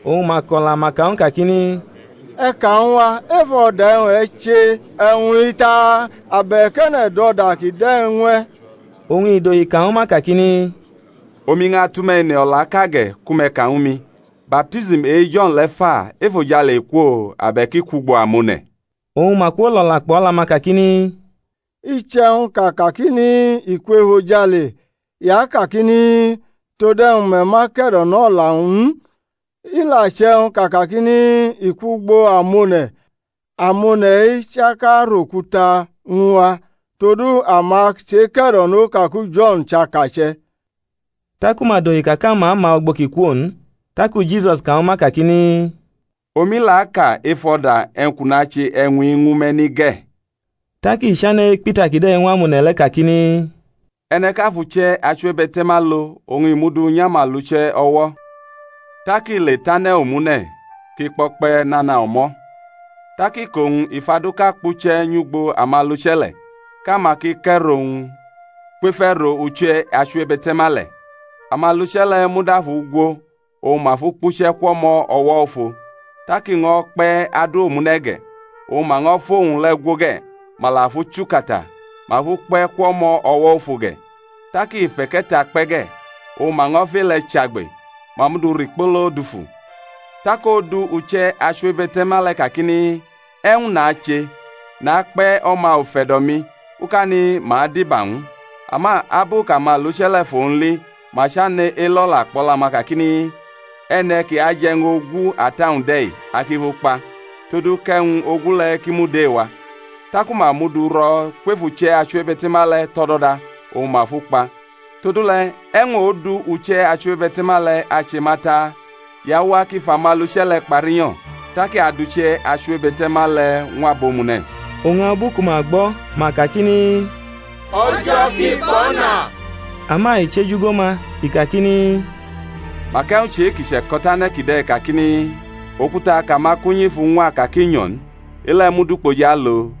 oñ ma ko̩la, ma ka ñw u, kakini, E̩ ka ñw a, ef o̩da e̩wñ e̩ che e̩wñ-i taa? Abe̩k e̩ne̩ dʼo̩da kide̩ ñw e̩? Oñ i dohi ka ñwu ma, kakini, Omi ñʼatʼume̩ ene o̩laʼka ge̩; ku me̩ ka ñwu mi: Baptism e-Jo̩n le̩ fa, efojale i kwo? abe̩k i kwʼugbo amone̩? Oñ ma kwolo̩la kpʼo̩la-ma kakini, Iche̩wñ kʼa kakini, I kwʼefojale, i akakini, Tode̩wñ me̩ ma ke̩do̩nʼo̩la-wñ n? I la che̩wñ kʼa akakini, I kwʼugbo amone̩, amone̩-i chaka arokuta ñw a, todu ama cheke̩do̩no ka ku Jo̩n chʼakache̩. Taku ma dohi ka kʼama ma ugbo kʼi kwo n. Taku Jisus ka ñwu ma kakini, Omi la aka ef o̩da e̩wñ kʼu nache e̩wñ-i ñwu me̩ ni ge̩. Tak i chane̩ ekpʼita kide̩ ñw amone̩ le̩ kakini, E̩ne̩ ʼka fʼuche̩ achiwebe̩te̩ma lo, oñ i mʼu du nyʼamaluche̩ o̩wo̩, tak i le tʼane̩ omune̩ kʼi kpo̩kpe̩ nana o̩mo̩. Tak iko-wñ i fʼaduʼka kpuche̩ nyʼugbo amaluche̩ le̩, kʼama ki kʼe̩ro ñw u kwef e̩ro uche̩ achiwebe̩te̩ma le̩. Amaluche̩ le̩ muda fʼu gwo, oñ ma fʼu kpuche̩ kwʼo̩mo̩ o̩wo̩ ofo. Tak i ño̩ kpe̩ adu omune̩ ge̩: oñ ma ño̩ fʼowñ le̩ gwo ge̩, ma la fʼu chukata, ma fʼu kpe̩ kwʼo̩mo̩ o̩wo̩ ofo ge̩. Tak i fʼe̩ke̩ta kpe̩ ge̩: oñ ma ño̩ fʼe-le̩ chagbe, ma mʼu du rikpolo dufu. Tak odu uche̩ achiwebe̩te̩ma le̩ kakini, E̩wñ nache? Nakpe̩ o̩ma ufe̩do̩-mi; ukani ma adiba ñw u. Ama abu kʼamaluche̩ le̩ fʼowñ li ma chane̩ elo̩la kpʼo̩la-ma kakini, E̩ne̩ ki aje̩ e̩wñ ogu ata-wñ de̩-i; a ki fʼu kpa, todu kʼe̩wñ-o̩gu le̩ ki mud e-wa. Taku ma mʼu du ro̩ kwef uche̩ achiwebe̩te̩ma le̩ tʼo̩do̩da, oñ ma fʼu kpa. Todule̩ e̩wñ odu uche̩ achiwebe̩te̩ma le̩ ache ma ta? I awa kʼi fʼamaluche̩ le̩ kpa rinyo̩, tak i adʼuche̩ achiwebe̩te̩ma le̩ ñw abomune̩. Oñ abu ku ma gbo̩, ma kakini, O̩jo̩ ki kpo̩na. Ama i cheju go ma, i kakini, Mak e̩wñ chʼe-ki che̩ko̩tane̩ kide̩ kakini, Okuta kʼamakunyi fʼu ñwa ka kʼi nyo̩ n, e-le̩ mud ukpoji alo̩?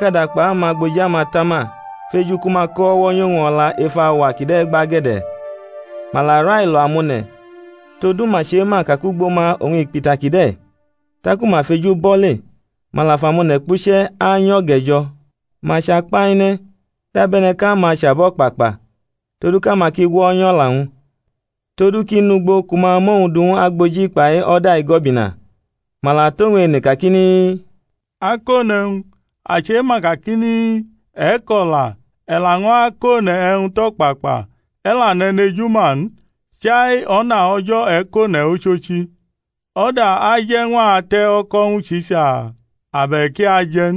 Tak amako̩takada kpai amagboji amatama feju ku ma ko o̩wo̩ nyʼowñ o̩la ef auwa kide̩ gbage̩de̩; ma la railo amone̩; todu ma chema ka kʼugbo ma oñ i kpʼita kide̩. Taku ma feju bʼo̩ le, ma la fʼamone̩ kpuche̩ anyo̩ge̩ jo̩, ma chakpaine̩ dabe̩ne̩ kʼama chʼabo̩kpakpa, todu kʼama ki gwonyʼo̩la-wñ, todu kʼi nʼugbo ku ma amʼowñ du ñw agboji kpai o̩da igo̩bina. Ma la tʼowñ ene kakini, Akone̩wñ, a chema kakini, E̩ ko̩la, e̩ laño̩ akone̩ e̩wñ tʼo̩kpakpa, e̩ la nʼe̩nejuma n, chai o̩na O̩jo̩ e̩ kʼone̩ ochochi: o̩da aje̩ ñw a te̩ o̩ko̩ ñwu Sisa? abe̩k i aje̩ n?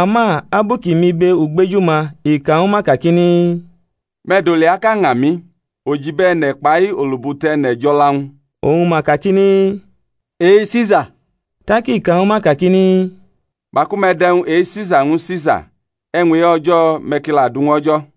Ama abu kʼi mʼibe ugbeju-ma i ka ñwu ma kakini, Me̩ dʼoliaʼka ña mi, ojibo e̩ne̩ kpai olubutu e̩ne̩ jʼo̩la-wñ? Oñ ma kakini, E-Sisa. Tak i ka ñwu ma kakini, Maku me̩ dʼe̩wñ e-Sisa ñwu Sisa, e̩wñ e-O̩jo̩ me̩ ki la du ñw O̩jo̩.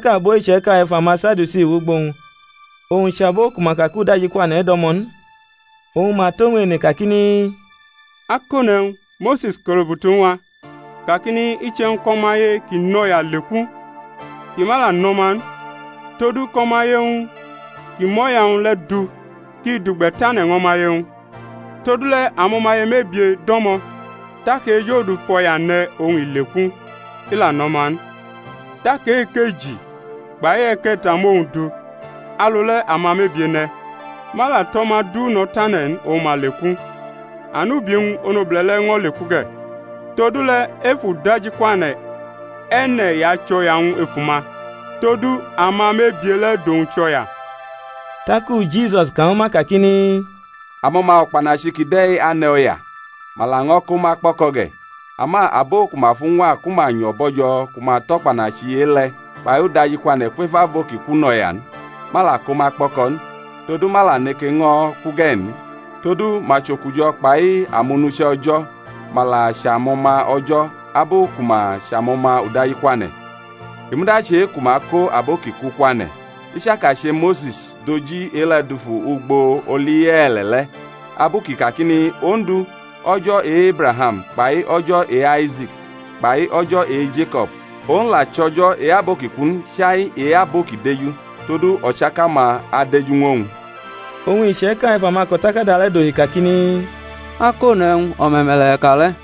Tak abo iche̩ka ef amaSadiusi wʼugbo-wñ, owñ chʼabo ku ma ka kʼudajikwane̩ do̩mo̩ n; oñ ma tʼowñ ene kakini, Akone̩wñ, Mose̩s ko̩lubutu ñw a, kakini, Iche̩wñ kʼo̩maye one̩ kʼi nʼo̩ya leku, kʼi ma la nʼo̩ma n todu kʼo̩maye-wñ ki mʼo̩ya-wñ le̩ du, kʼi dʼugbe̩ tane̩ ñw o̩maye-wñ. Todule̩ amo̩maye mebie do̩mo̩: tak e-ejodudu fʼo̩ya ne̩ oñ i leku, i la nʼo̩ma n; tak e-ekeji kpai e-e̩ke̩ta mʼowñ du; alu le̩ amamebie ne̩, ma la tʼo̩ma du no̩ tane̩ n, oñ ma leku, anubi-wñ onobule̩ le̩ ño̩ leku ge̩. Todule̩ ef udajikwane̩ e̩ne̩ i achʼo̩ya-wñ ef uma? Todu amamebie le̩ dʼowñ chʼo̩ya. Taku Jisus ka ñwu ma kakini, Amo̩ma o̩kpanachi kide̩ ane̩ o̩ya, ma laño̩ ko ma kpo̩ko̩ ge̩: ama abo ku ma fuñwa ku ma nyo̩ bo̩jo̩ ku ma tʼo̩kpanachi e-le̩ kpai udajikwane̩ kwef abo ki ku, nʼo̩ya n, ma la ko ma kpo̩ko̩ n; todu ma la neke ño̩ ku ge̩ n: todu ma chʼokujo̩ kpai amonuche̩ O̩jo̩; ma la chʼamo̩ma O̩jo̩, abu ku ma chʼamo̩ma udajikwane̩. I muda chʼe-ku ma ako abo ki ku kwane̩, i chaka che Mose̩s dʼoji e-le̩ dufu ugbo oli ye̩e̩le̩ le̩, abu kʼi kakini, Ondu, O̩jo̩ e-Ebraham, kpai O̩jo̩ e-Aise̩k, kpai O̩jo̩ e-Jeko̩b. Owñ la chʼO̩jo̩ e-abo ki ku n, chai e-abo ki deju: todu o̩chaka-ma adeju ñw owñ. Oñ iche̩ka ef amako̩takada le̩ dohi kakini, Akone̩wñ, o̩me̩me̩le̩ e̩ ka le̩.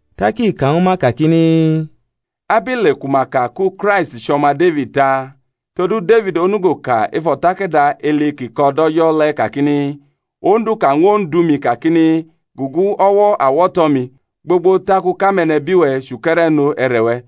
Tak i ka ñwu ma kakini, Abile ku ma ka ku Kraist chʼO̩ma Defid ta? Todu Defid onugo ka ef o̩takada Eli kʼi ko̩ dʼO̩jo̩ le̩ kakini, Ondu ka ñw Ondu-mi kakini, Gugu o̩wo̩ awo̩to̩-mi, Gbogbo tak u kʼame̩nebi-we̩ chʼuke̩re̩no e̩re̩-we̩.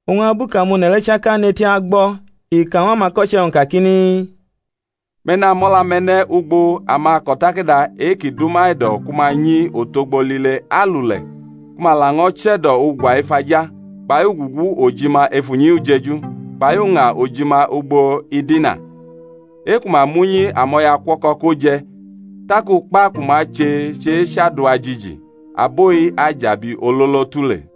Oñ abu kʼamone̩ le̩ chaka nʼeti agbo̩ i ka ñw amako̩che̩-wñ kakini, Me̩ namʼo̩la-me̩ ne̩ ugbo amako̩takada e-ki dʼuma e̩do̩ ku ma nyi otogbo lile alule̩ ku ma laño̩ che̩do̩ ugwa ef aja, kpai ugugu ojima ef unyi ujeju, kpai uña ojima ugbo idina, e-ku ma mʼunyi amo̩yaukuo̩ko̩ ko je̩, tak ukpa ku ma ache chʼechadua jiji. Abo-i ajʼabi ololo tule.